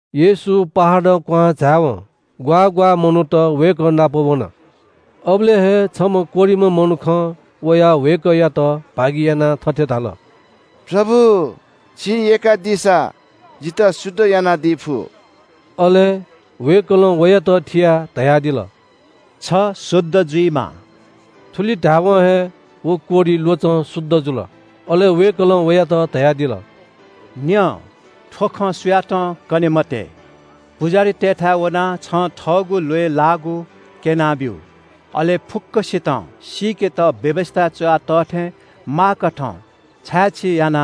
येशू पहाडं क्‍वहां झाय्‌वं ग्‍वाः ग्‍वाः मनूत वय्‌कः नाप वन। अबलय् हे छम्‍ह कोह्रिम्‍ह मनुखं वयाः वय्‌कःयात भागियानाः थथे धाल – “प्रभु, छिं यय्‌कादीसा जितः शुद्ध यानादी फु।” अले वय्‌कलं वयात थियाः धयादिल – “छ शुद्ध जुइमा।” थुलि धाय्‌वं हे व कोह्रि ल्‍वचं शुद्ध जुल। अले वय्‌कलं वयात धयादिल – “न्‍यँ, थ्‍व खँ सुयातं कने मते। पुजाहारीतय्‌थाय् वनाः छं थःगु ल्‍वय् लाःगु क्‍यँ। अले फुक्‍कसितं सीकेत व्‍यवस्‍थाय् च्‍वया तः थें माःकथं छाय्‌छी या।”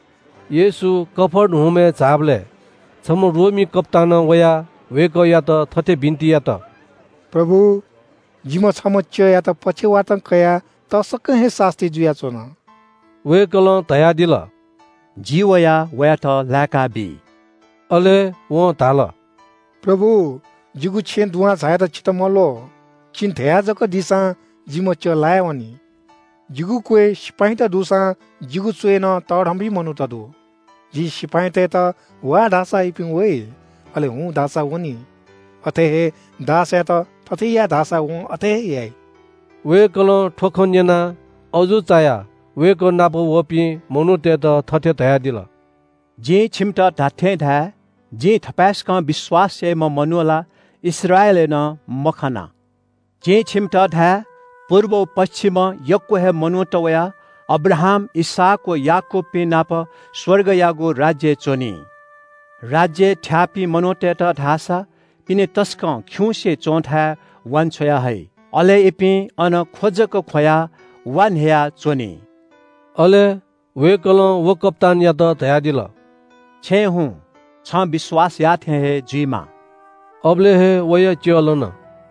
येशू कफर्नहुमय् झाःबलय् छम्‍ह रोमी कप्‍तानं वयाः वय्‌कःयात थथे बिन्‍ति यात – “प्रभु, जिम्‍ह छम्‍ह च्‍यःयात पक्षवातं कयाः तसकं हे सास्‍ती जुयाच्‍वन।” वय्‌कलं धयादिल – “जि वयाः वयात लाय्‌काबी।” अले वं धाल – “प्रभु, जिगु छेँय् दुहां झायेत छितः मल्‍वः। छिं धया जक दीसां जिम्‍ह च्‍यः लायावनी। जिगु क्‍वय् सिपाइँत दुसां जिगु च्‍वय्‌नं तःधंपिं मनूत दु। जिं सिपाइँतय्‌त ‘वा’ धाःसा इपिं वइ। अले ‘हुँ’ धाःसा वनी। अथे हे दासयात ‘थथे या’ धाःसा वं अथे हे याइ।” वय्‌कलं थ्‍व खँ न्‍यनाः अजू चायाः वय्‌कः नाप वःपिं मनूतय्‌त थथे धयादिल – “जिं छिमित धात्‍थें धाये – जिं थपाय्‌सकं विश्‍वास याइम्‍ह मनू ला इस्राएलय् हे नं मखना। जिं छिमित धाये – पुर्ब व पच्‍छिमं यक्‍व हे मनूत वयाः अब्राहाम, इसहाक व याकूबपिं नाप स्‍वर्गयागु राज्‍यय् च्‍वनी। राज्‍यय् थ्‍याःपिं मनूतय्‌त धाःसा पिने तसकं खिउँसे च्‍वंथाय् वान्‍छ्वया हइ। अले इपिं अन ख्‍व जक ख्‍वयाः वा न्‍ह्ययाच्‍वनी।” अले वय्‌कलं व कप्‍तानयात धयादिल – “छेँय् हुँ छ, छं विश्‍वास याःथें हे जुइमा।” अबलय् हे वया च्‍यः लन।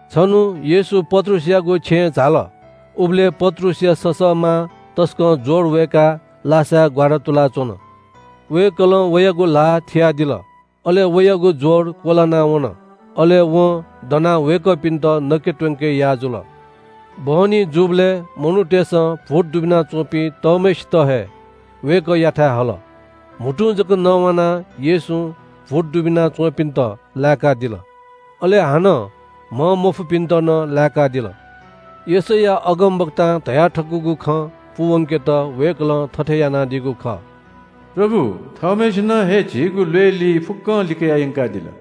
छन्‍हु येशू पत्रुसयागु छेँय् झाल। उबलय् पत्रुसया ससःमां तसकं ज्‍वर वय्‌काः लासाय् ग्‍वारातुलाच्‍वन। वय्‌कलं वयागु ल्‍हाः थियादिल। अले वयागु ज्‍वर क्‍वलाना वन। अले वं दनाः वय्‌कःपिन्‍त नके त्‍वंके याः जुल। बहनी जूबलय् मनूतय्‌सं भूत दुबिना च्‍वंपिं तःम्‍हय्‌सित हे वय्‌कःयाथाय् हल। म्‍हुतुं जक नवानाः येशूं भूत दुबिना च्‍वंपिन्‍त लाय्‌कादिल, अले हानं म्‍हंमफुपिन्‍त नं लाय्‌कादिल। यशैया अगमवक्तां धयाथकूगु खँ पूवंकेत वय्‌कलं थथे यानादीगु खः – “प्रभु थःम्‍हय्‌सिनं हे झीगु ल्‍वय्‌ली फुक्‍कं लिकयाः यंकादिल।”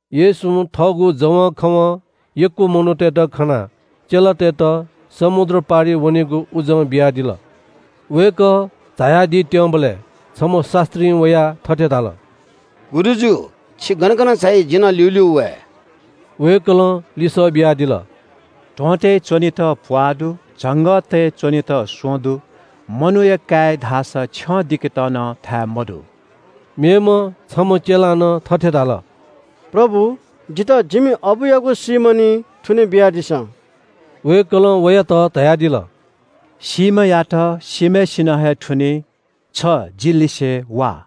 येशूं थःगु जवंखवं यक्‍व मनूतय्‌त खनाः चेलातय्‌त समुद्र पारि वनेगु उजं बियादिल। वय्‌कः झायादीत्‍यंबलय् छम्‍ह शास्‍त्रीं वयाः थथे धाल – “गुरुजु, छि गन गन झाइ जि नं ल्‍यूल्‍यू वये।” वय्‌कलं लिसः बियादिल – “ध्‍वंतय् च्‍वनेत प्‍वाः दु, झंगःतय् च्‍वनेत स्‍वँ दु, मनूया काय्‌या धाःसा छ्यं दिकेत नं थाय् मदु।” मेम्‍ह छम्‍ह चेलां नं थथे धाल – “प्रभु, जितः जिमि अबुयागु सीम्‍ह निं थुने बियादिसँ।” वय्‌कलं वयात धयादिल – “सीम्‍हयात सीम्‍हय्‌सिनं हे थुनी। छ जि लिसे वा।”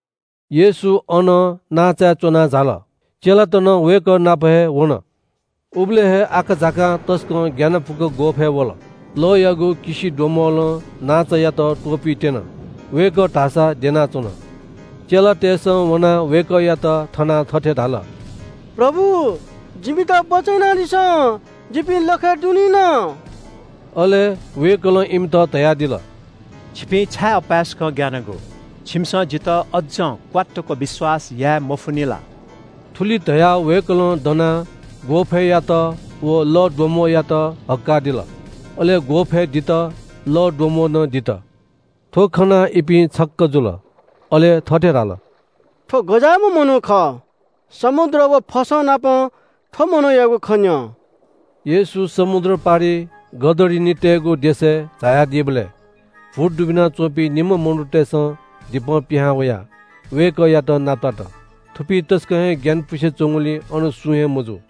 येशू अनं नांचाय् च्‍वनाः झाल। चेलात नं वय्‌कः नाप हे वन। उबलय् हे आकाझाकां तसकं ग्‍यानापुक ग्‍वःफय् वल। लःयागु किसिद्वम्‍बलं नांचायात त्‍वपुइत्‍यन। वय्‌कः धाःसा द्यनाच्‍वन। चेलातय्‌सं वनाः वय्‌कःयात थनाः थथे धाल – “प्रभु, जिमित बचय् यानादिसँ। जिपिं लखय् दुनिन।” अले वय्‌कलं इमित धयादिल – “छिपिं छाय् अपाय्‌सकं ग्‍यानागु? छिमिसं जितः अज्‍जं क्‍वात्तुक विश्‍वास याये मफुनि ला?” थुलि धयाः वय्‌कलं दनाः ग्‍वःफय्‌यात व लःद्वम्‍बःयात हक्‍कादिल। अले ग्‍वःफय् दित, लःद्वम्‍बः नं दित। थ्‍व खनाः इपिं छक्‍क जुल। अले थथे धाल – “थ्‍व गज्‍याःम्‍ह मनू खः? समुद्र व फसंनापं थ्‍व मनूयागु खँ न्‍यं।” येशू समुद्र पारिइ गदरिनीतय्‌गु देशय् झायादीबलय् भूत दुबिना च्‍वंपिं निम्‍ह मनूतय्‌सं दिपं पिहां वयाः वय्‌कःयात नापलात। थुपिं तसकं हे ग्‍यानपुसे च्‍वंगुलिं अनं सुं हे मजू।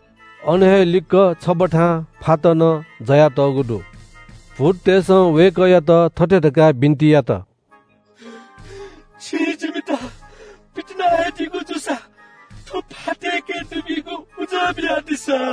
अन हे लिक्‍क छबथां फात नं ज्‍वया तःगु दु। भूततय्‌सं वय्‌कःयात थथे धकाः बिन्‍ति यात – “छिं जिमित पितिना हे दीगु जूसा थ्‍व फातय्‌के दुबीगु उजं बियादिसँ।”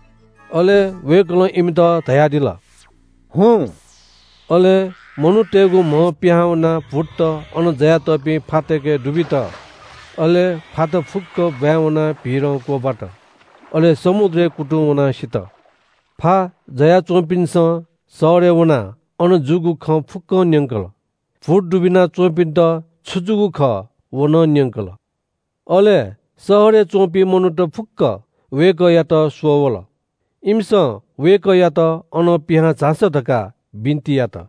अले वय्‌कलं इमित धयादिल – “हुँ।” अले मनूतय्‌गु म्‍हं पिहां वनाः भूतत अन ज्‍वयातःपिं फातय्‌के दुबित। अले फात फुक्‍क ब्‍वाँय् वनाः भीरं क्‍वब्‍वात। अले समुद्रय् कुतुं वनाः सित। फा ज्‍वयाच्‍वंपिन्‍सं शहरय् वनाः अन जूगु खँ फुक्‍कं न्‍यंकल। भूत दुबिना च्‍वंपिन्‍त छु जूगु खः व नं न्‍यंकल। अले शहरय् च्‍वंपिं मनूत फुक्‍क वय्‌कःयात स्‍वः वल। इमिसं वय्‌कःयात अनं पिहां झासँ धकाः बिन्‍ति यात।